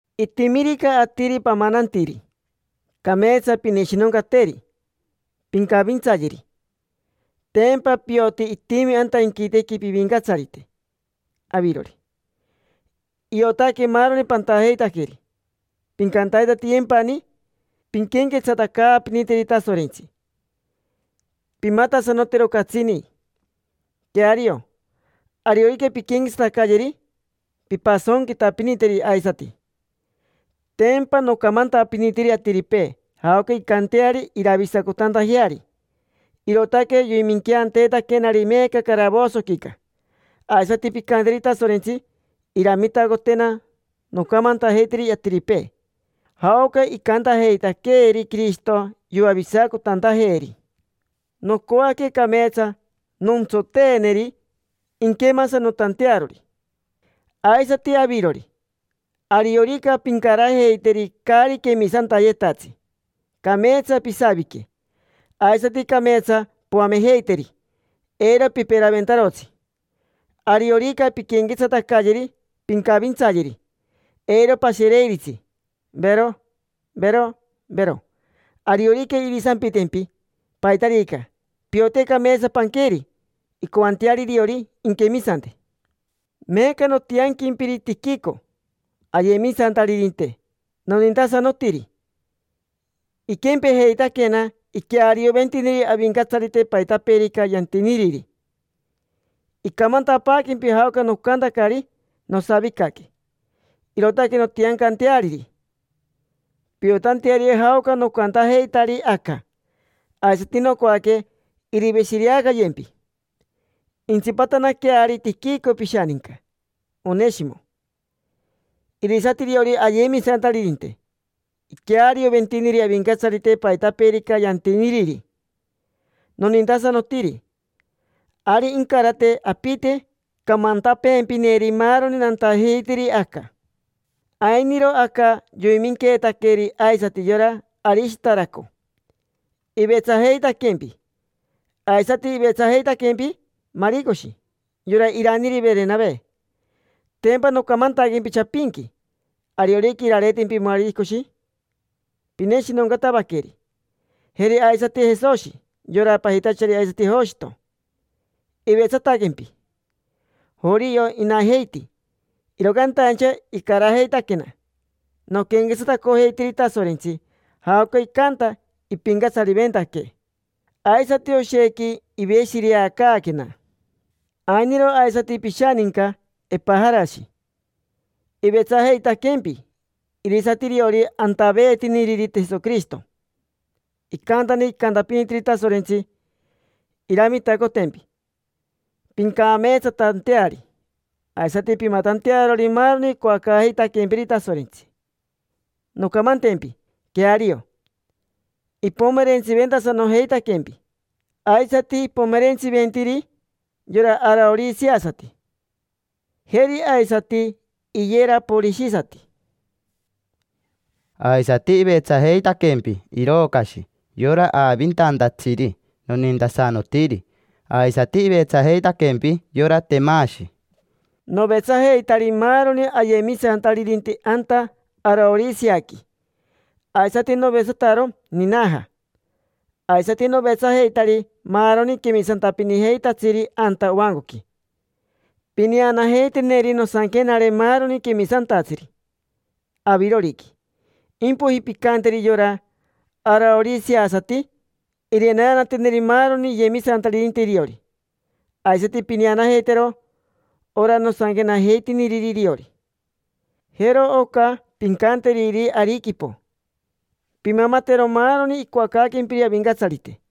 Itimirica atiri pamanantiri, cameetsa pineshinoncateri, pincavintsayeri. Tempa pioti itimi anta inquitequi pivincatsarite avirori: iotaque maaroni pantajeitaqueri. Pincantaitatiyempani pinquenquetsatacaapiniteri Tasorentsi, pimatasanotero catsini. Queario, ariorica pinquenquetsatacayeri, pimpasonquitapiniteri aisati. Tempa nocamantapinitiri atiripee jaoca incanteari iravisacotantajeari, irootaque yoiminqueanteetaquenari meeca caravosoquica. Aisati pincanteri Tasorentsi iramitacotena noncamantajeiteri atiripee jaoca icantajeitaqueeri Quirishito yoavisacotantajeeri. Nocoaque cameetsa nontsoteeneri, inquemasanotantearori. Aisati avirori, ariorica pincarajeiteri caari quemisantayetatsi, cameetsa pisavique, aisati cameetsa poamejeiteri, eiro piperaventarotsi. Ariorica pinquenquetsatacayeri, pincavintsayeri. Eiro pashereiritsi: vero, vero, vero. Ariorica irisampitempi paitarica, piote cameetsa panqueri incoanteari iriori inquemisante. Meeca nontianquempiri Tiquico, ayemisantaririnte nonintasanotiri. Iquempejeitaquena, iquearioventiniri Avincatsarite paitapeerica yantiniriri. Incamantapaaquempi jaoca nocantacari nosavicaque. Irootaque nontiancanteariri, piotanteari jaoca nocantajeitari aca. Aisati nocoaque iriveshireacayempi. Intsipatanaqueari Tiquico pishaninca Oneshimo. Irisati iriori ayemisantaririnte, iquearioventiniri Avincatsarite paitapeerica yantiniriri. Nonintasanotiri. Ari incarate apite camantapeempineri maaroni nantajeitiri aca. Ainiro aca yoiminqueetaqueri aisati yora Arishitaraco, ivetsajeitaquempi. Aisati ivetsajeitaquempi Maricoshi, yora iraniri Verenave. Tempa nocamantaquempi chapinqui: ariorica irareetempi Maricoshi, pineshinoncatavaqueri. Jeri aisati Jesoshi, yora pajitachari aisati Joshito, ivetsataquempi. Jorio inajeiti, iro cantaincha icarajeitaquena noquenquetsatacojeitiri Tasorentsi, jaoca icanta ipincatsariventaquee. Aisati oshequi iveshireacaaquena. Ainiro aisati pishaninca Epajarashi, ivetsajeitaquempi. Irisati iriori antaveetiniriri Jesoquirishito. Icantani icantapinitiri Tasorentsi iramitacotempi pincameetsatanteari, aisati pimatantearori maaroni icoacaajeitaquempiri Tasorentsi. Noncamantempi: queario, ipomerentsiventasanojeitaquempi. Aisati ipomerentsiventiri yora araoriseasati, jeri aisati iyeraporishisati. Aisati ivetsajeitaquempi Irocashi: yora aavintantatsiri nonintasanotiri. Aisati ivetsajeitaquempi yora Temashi. Novetsajeitari maaroni ayemisantaririnte anta Araoriseaqui, aisati novetsataro Ninaja, aisati novetsajeitari maaroni quemisantapinijeitatsiri anta ovancoqui. Pineanajeiteneri nosanquenare maaroni quemisantatsiri aviroriqui. Impoiji pincanteri yora araoriseasati irineanateneri maaroni iyemisantaririnte iriori. Aisati pineanajeitero ora nosanquenajeitiniriri iriori. Jero oca pincanteriri Ariquipo: “Pimamatero maaroni icoacaaquempiri Avincatsarite”.